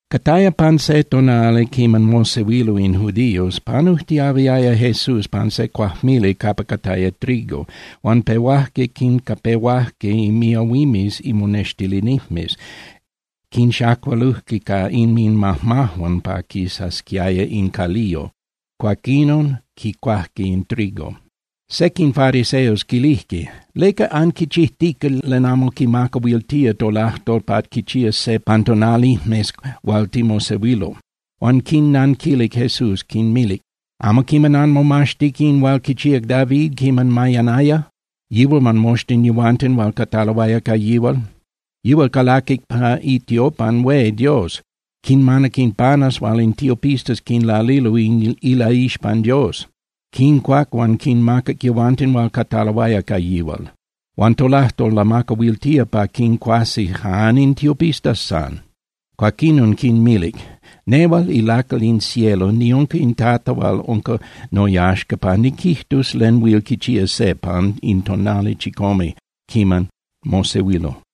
Cataya pan se tonali quiman mosehuilo in judíos, panujtiahuiaya Jesús pan se cuajmili capa cataya trigo, huan pehuajque quincapehuajque miahuimes imonextilinijmes, quinxacualujque ca inminmajmajuan pa quisasquiaya in caliyo, cuaquinon quicuajque in trigo. Sequin fariseos quilijque: —¿Leca anquichijtica len amo quimacahuiltía tolajtol pa quichías se pan tonalijmes hual timosehuilo? Huan quinnanquilic Jesús, quinmilic: —¿Amo quiman anmomaxtic in hual quichíac David quiman mayanaya, yihual huan moxtin yehuanten hual cataloaya ca yihual? Yihual calaquic pa itiopan hué Dios, quinmanac in panes hual in tiopistas quinlalilo ilaixpan Dios. Quincuac huan quinmacac yehuanten hual cataloaya ca yihual. Huan tolajtol lamacahuiltía pa quincuasi jan in tiopistas san. Cuaquinon quinmilic: —Nehual ilacal in cielo niunca in Tata hual unca noyaxca pa niquijtus len huil quichía se pan in tonali chicome quiman mosehuilo.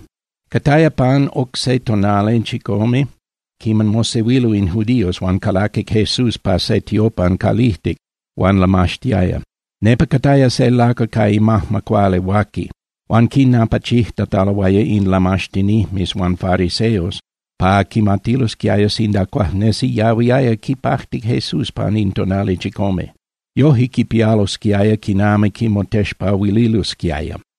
Cataya pan oc se tonali chicome quiman mosehuilo in judíos, huan calaquic Jesús pa se tiopan calijtic huan lamaxtiaya. Nepa cataya se lacal ca imajma cuali huaqui. Huan quinapachijtataloaya in lamaxtinijmes huan fariseos pa quimatilosquiaya sinda cuajnesi yahuiaya quipajti Jesús pan in tonali chicome. Yoje quipialosquiaya quinami quimotexpahuililosquiaya.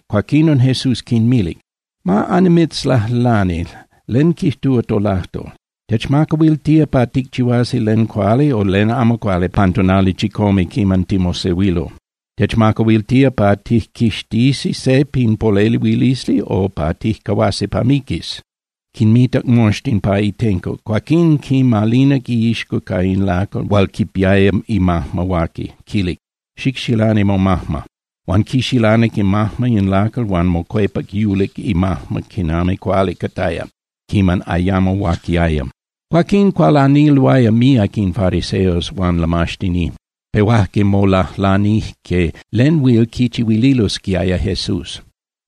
Cuaquinon Jesús quinmilic: —Ma annimitzlajlani, ¿len quijtúa tolajtol? ¿Techmacahuiltía pa ticchihuasi len cuali o len amo cuali pan tonali chicome quiman timosehuilo? ¿Techmacahuiltía pa tijquixtisi se pin polehuilisli o pa tijcahuasi pa miquis? Quinmitac moxtin pa itenco, cuaquín quimalinac iixco ca in lacal hual quipiaya imajma huaqui, quilic: —Xicxilani momajma. Huan quixilanic imajma in lacal huan mocuepac yulic imajma quinami cuali cataya quiman ayamo huaquiaya. Cuaquín cualaniloaya míac in fariseos huan lamaxtinijmes, pehuajque molajlanijque len huil quichihuililosquiaya Jesús.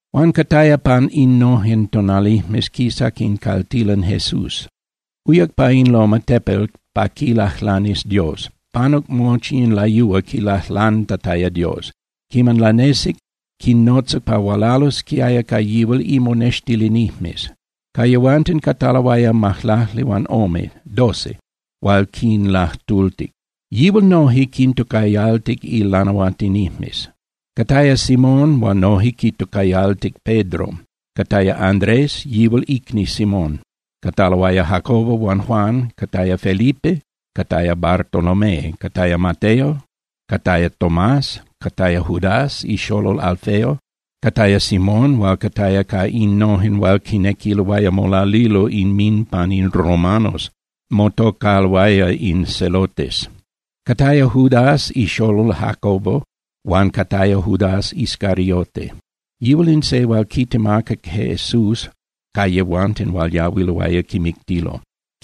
Huan cataya pan innojen tonalijmes quisac in caltilan Jesús. Uyac pa in loma (tepel) pa quilajlanis Dios, panuc mochi in layúa quilajlantataya Dios. Quiman lanesic, quinnotzac pa hualalosquiaya ca yihual imonextilinijmes. Ca yehuanten cataloaya majlaclihuanome (doce) hual quinlajtultic. Yihual noje quintocayaltic ilanahuatinijmes. Cataya Simón hual noje quitocayaltic Pedro, cataya Andrés, yihual icni Simón, cataloaya Jacobo huan Juan, cataya Felipe, cataya Bartolomé, cataya Mateo, cataya Tomás, cataya Judás ixolol Alfeo, cataya Simón hual cataya ca innojen hual quinequiloaya molalilo inminpan in romanos, motocaloaya in Zelotes, cataya Judás ixolol Jacobo, huan cataya Judás Iscariote. Yihual in se hual quitemacac Jesús ca yehuanten hual yahuiloaya quimictilo.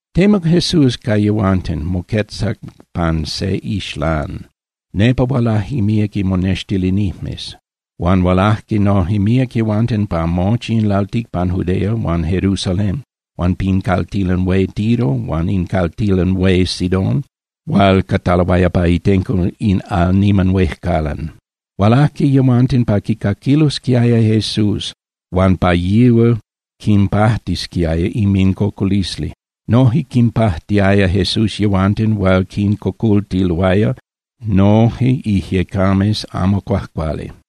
Temuc Jesús ca yehuanten, moquetzac pan se ixlán. Nepa hualaje míac imonextilinijmes, huan hualaje noje míac yehuanten pa mochi in lalticpan Judea huan Jerusalén huan pin caltilan hué Tiro huan in caltilan hué Sidón hual cataloaya pa itenco in al niman huejcalan. Hualajque yehuanten pa quicaquilosquiaya Jesús huan pa yihual quinpajtisquiaya inmincocolisli. Noje quinpajtiaya Jesús yehuanten hual quincocoltiloaya noje ijyecames amo cuajcuali.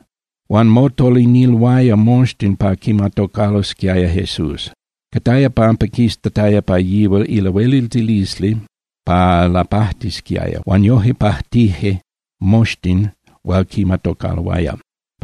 Huan motoliniloaya moxtin pa quimatocalosquiaya Jesús. Cataya pampa quistataya pa yihual ilahueliltilisli pa lapajtisquiaya huan yoje pajtije moxtin hual quimatocaloaya.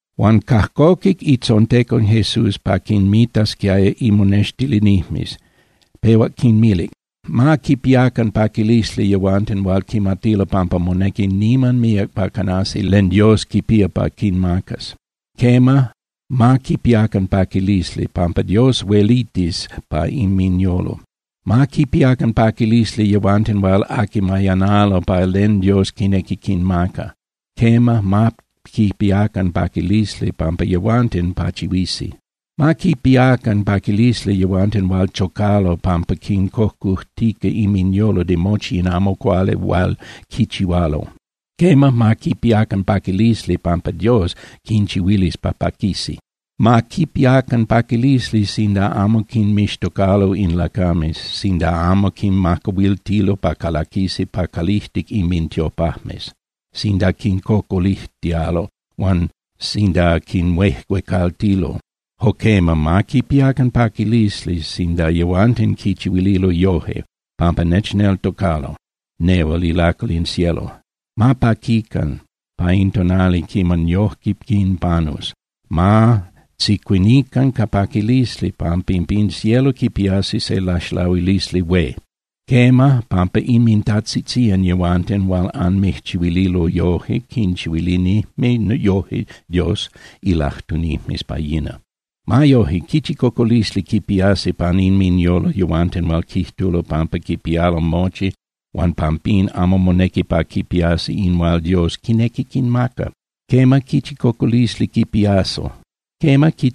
Huan cajcoquic itzontecon Jesús pa quinmitasquiaya imonextilinijmes, pehuac quinmilic: —Ma quipiacan paquilisli yehuanten hual quimatilo pampa monequi niman míac pa canasi len Dios quipía pa quinmacas. Quema, ma quipiacan paquilisli, pampa Dios huelitis pa inminyolo. ’Ma quipiacan paquilisli yehuanten hual aqui mayanalo pa len Dios quinequi quinmaca. Quema, ma quipiacan paquilisli, pampa yehuanten pachihuisi. ’Ma quipiacan paquilisli yehuanten hual chocalo pampa quincocujtica inminyolo de mochi in amo cuali hual quichihualo. Quema, ma quipiacan paquilisli, pampa Dios quinchihuilis pa paquisi. ’Ma quipiacan paquilisli sinda amo quinmixtocalo in lacames, sinda amo quinmacahuiltilo pa calaquisi pa calijtic inmintiopajmes, sinda quincocolijtialo huan sinda quinhuejuecaltilo. Jo quema, ma quipiacan paquilisli sinda yehuanten quinchihuililo yoje pampa nechneltocalo nehual ilacal in cielo. Ma paquican pa in tonali quiman yoje quinpanus, ma tzicuinican ca paquilisli, pampa pin cielo quipiasi se laxlahuilisli hué. Quema, pampa inmintajtzitzían yehuanten hual anmijchihuililo yoje quinchihuilinijme yoje Dios ilajtunijmes pa yina. ’Ma yoje, quichi cocolisli quipiasi pan inminyolo yehuanten hual quijtulo pampa quipialo mochi huan pampín amo monequi pa quipiasi in hual Dios quinequi quinmaca. Quema, quichi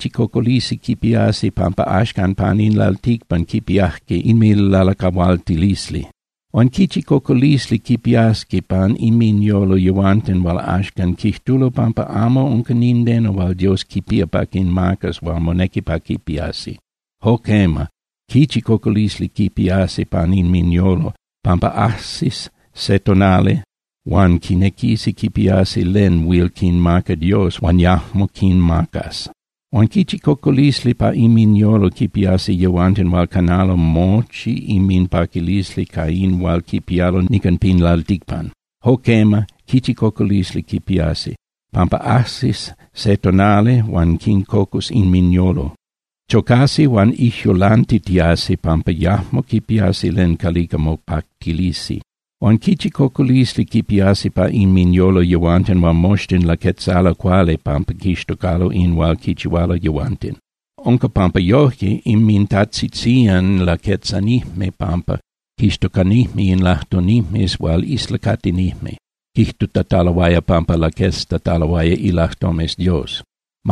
cocolisli quipiasi pampa axcan pan in lalticpan quipiajque inminlalacahualtilisli. ’Huan quichi cocolisli quipiasqui pan inminyolo yehuanten hual axcan quijtulo pampa amo unca nindeno hual Dios quipía pa quinmacas hual monequi pa quipiasi. Jo quema, ¡quichi cocolisli quipiasi pan inminyolo, pampa ajsis se tonali huan quinequisi quipiasi len huil quinmaca Dios huan yajmo quinmacas! ’Huan quichi cocolisli pa inminyolo quipiasi yehuanten hual canalo mochi inminpaquilisli ca in hual quipialo nican pin lalticpan. Jo quema, quichi cocolisli quipiasi. Pampa ajsis se tonali huan quincocus inminyolo, chocasi huan ijyulantitiasi pampa yajmo quipiasi len calica mopactilisi. ’Huan quichi cocolisli quipiasi pa inminyolo yehuanten hual moxtin laquetzalo cuali pampa quixtocalo in hual quichihualo yehuanten. Unca pampa yoje inmintajtzitzían laquetzanijme pampa quixtocanijme in lajtunijmes hual islacatinijme, quijtutataloaya pampa laqueztataloaya ilajtomes Dios.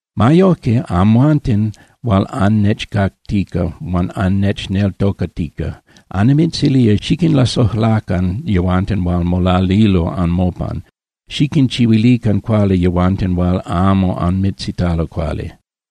’Ma yojque, amhuanten hual annechcactica huan annechneltocatica, annimitzilía xiquinlasojlacan yehuanten hual molalilo anmopan, xiquinchihuilican cuali yehuanten hual amo anmitzitalo cuali.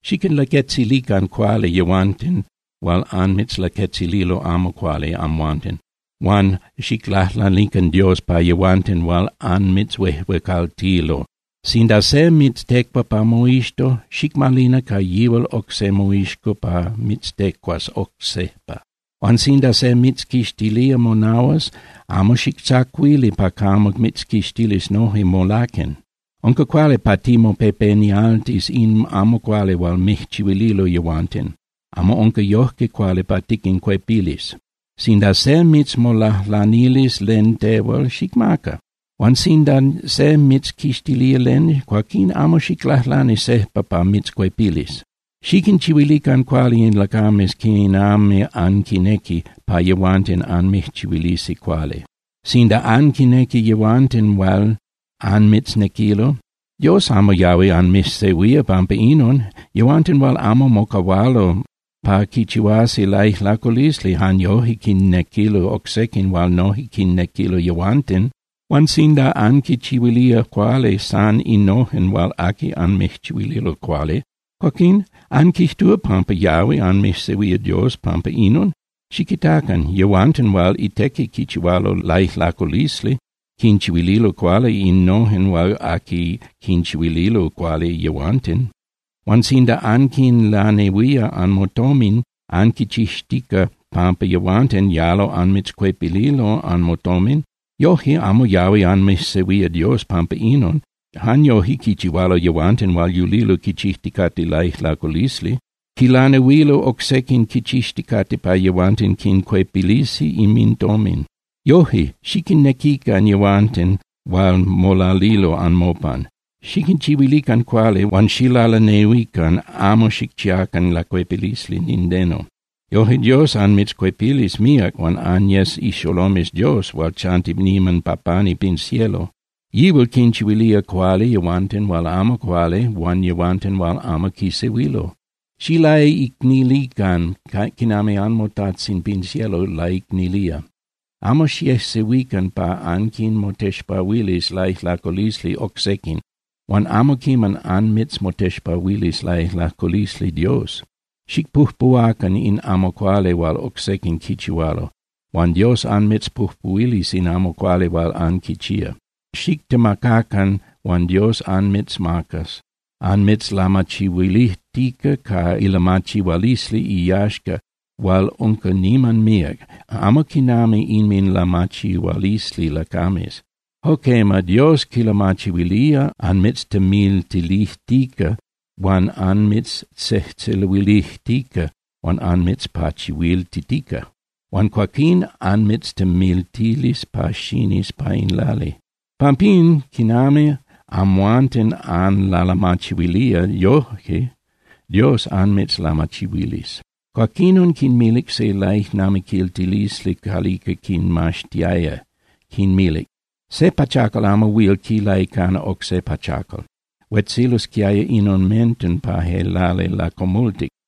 Xiquinlaquetzilican cuali yehuanten hual anmitzlaquetzililo amo cuali amhuanten, huan xiclajlanican Dios pa yehuanten hual anmijchihuililo amo cuali. Sinda se mitztecua pa moixco, xicmalina ca yihual oc se moixco pa mitztecuas oc sejpa. Huan sinda se mitzquixtilía monahuas, amo xictzacuili pa camo mitzquixtilis noje molaquen. Unca cuali pa timopepenialtis in amo cuali hual mijchihuililo yehuanten. Amo unca yojque cuali pa tiquincuepilis. ’Sinda se mitzmolajlanilis len tehual, xicmaca. Huan sinda se mitzquixtilía len, cuaquín amo xiclajlani sejpa pa mitzcuepilis. ’Xiquinchihuilican cuali in lacames quinami anquinequi pa yehuanten anmijchihuilisi cuali. Sinda anquinnequi yehuanten hual anmitznequilo, Dios amo yahui anmijsehuía pampa inon. Yehuanten hual amo mocahualo pa quichihuasi laijlaculisli jan yoje quinnequilo oc sequin hual noje quinnequilo yehuanten. Huan sinda anquichihuilía cuali san innojen hual aqui anmijchihuililo cuali, cuaquín ¿anquijtúa pampa yahui anmijsehuía Dios pampa inon? Xiquitacan. Yehuanten hual itequi quichihualo laijlaculisli quinchihuililo cuali innojen hual aqui quinchihuililo cuali yehuanten. Huan sinda anquinlanehuía anmotomin anquichixtica pampa yehuanten yalo anmitzcuepililo anmotomin, yoje amo yahui anmijsehuía Dios pampa inon. Jan yoje quichihualo yehuanten hual yulilo quichijticate laijlaculisli. Quilanehuilo oc sequin quichixticate pa yehuanten quincuepilisi inmintomin. Yoje, xiquinnequican yehuanten hual molalilo anmopan, xiquinchihuilican cuali huan xilalanehuican, amo xicchiacan lacuepilisli nindeno. Yoje Dios anmitzcuepilis míac huan anyes ixolomes Dios hual chanti niman pa pani pin cielo. Yihual quinchihuilía cuali yehuanten hual amo cuali huan yehuanten hual amo quisehuilo. Xilaicnilican quinami anmoTajtzin pin cielo laicnilía. ’Amo xiejsehuican pa anquinmotexpahuilis laijlaculisli oc sequin huan amo quiman anmitzmotexpahuilis laijlaculisli Dios. Xicpujpuhuacan in amo cuali hual oc sequin quichihualo, huan Dios anmitzpujpuhuilis in amo cuali hual anquichía. Xitemacacan huan Dios anmitzmacas, anmitzlamachihuilijtica ca ilamachihualisli iyaxca hual unca niman míac, amo quinami inminlamachihualisli lacames. Jo quema, Dios quilamachihuilía anmitztemiltilijtica huan anmijtzejtzeluilijtica huan anmitzpachihuiltitica, huan cuaquín anmitztemiltilis pa xinis pa in lali. Pampín, quinami amhuanten anlalamachihuilía, yoje Dios anmitzlamachihuilis. Cuaquinon quinmilic se laijnamiquiltilisli calica quinmaxtiaya, quinmilic: —Se pachacal amo huil quilaicana oc se pachacal. Huetzilosquiaya in omenten pa je lali lacomultic.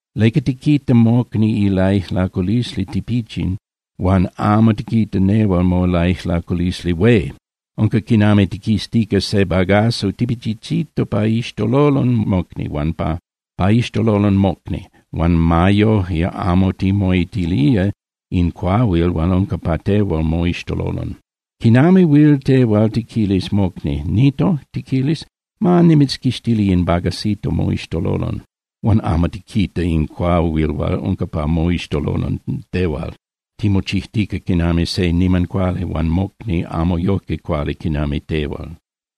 ¿Leca tiquita mocni ilaijlaculisli tipichin huan amo tiquita tehual molaijlaculisli hué? Unca quinami tiquiztica se bagazo tipichichito pa iixtololon mocni, huan ma yoje amo timoitilía in cuahuil hual unca pa tehual moixtololon. ¿Quinami huil tehual tiquilis mocni: “Nito”, tiquilis, “ma nimitzquixtili in bagacito moixtololon”? Huan ¡amo tiquita in cuahuil hual unca pa moixtololon tehual! ¡Timochijtica quinami se niman cuali huan mocni amo yojque cuali quinami tel!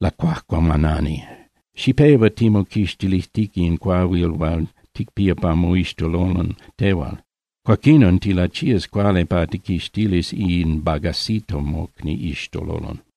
¡Lacuajcuamanani! Xipehua timoquixtilijtica in cuahuil hual ticpía pa moixtololon tehual. Cuaquinon tilachías cuali pa tijquixtilis in bagacito mocni iixtololon.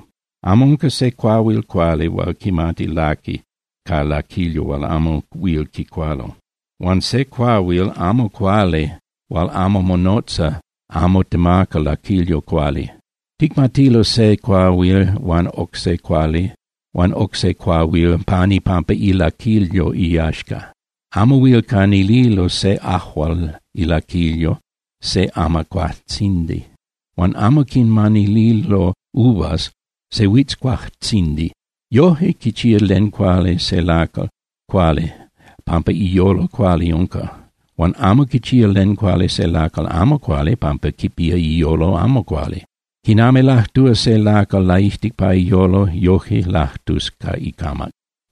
’Amo unca se cuahuil cuali hual quimati laqui ca laquilyo hual amo huil quicualo. Huan se cuahuil amo cuali hual amo monotza amo temaca laquilyo cuali. Ticmatilo se cuahuil huan oc se cuahuil pan ipampa ilaquilyo iyaxca. Amo huil canililo se ajual ilaquilyo se amacuajtzindi. Huan amo quinmanililo uvas se huitzcuajtzindi. Yoje quichía len cuali se lacal cuali pampa iyolo cuali unca, huan amo quichía len cuali se lacal amo cuali pampa quipía iyolo amo cuali. Quinami lajtúa se lacal laijtic pa iyolo, yojque lajtus ca icamac.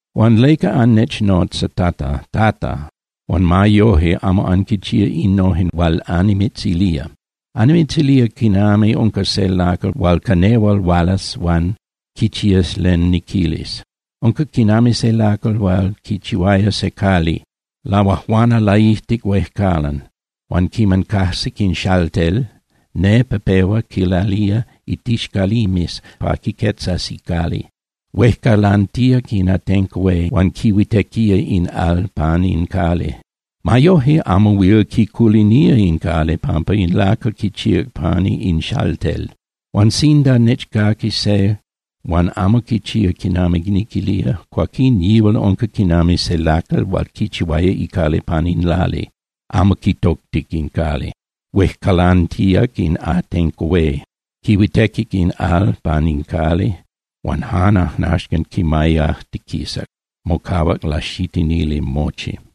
’Huan ¿leca annechnotza “Tata, Tata”, huan ma yoje amo anquinchía innojen hual annimitzilía? Annimitzilía quinami unca se lacal hual ca nehual hualas huan quichías len niquilis. Unca quinami se lacal hual quichihuaya se cali. Lahuajuana laijtic huejcalan. Huan quiman cajsic in xaltel, nepa pehua quilalía in tixcalimes pa quiquetzas icali. Huejcalantíac in atenco hué huan quihuitequía in al pan in cali. Ma yojque amo huil quiculinía in cali pampa in lacal quichíac pani in xaltel. Huan sinda nechcaqui se huan amo quichía quinami niquilía, cuaquín yihual unca quinami se lacal hual quichihuaya icali pan in lali, amo quitoctic in cali. Huejcalantíac in atenco hué, quihuitequic in al pan in cali, huan jan ajnaxcan quimayajtiquisac, mocahuac laxitinili mochi.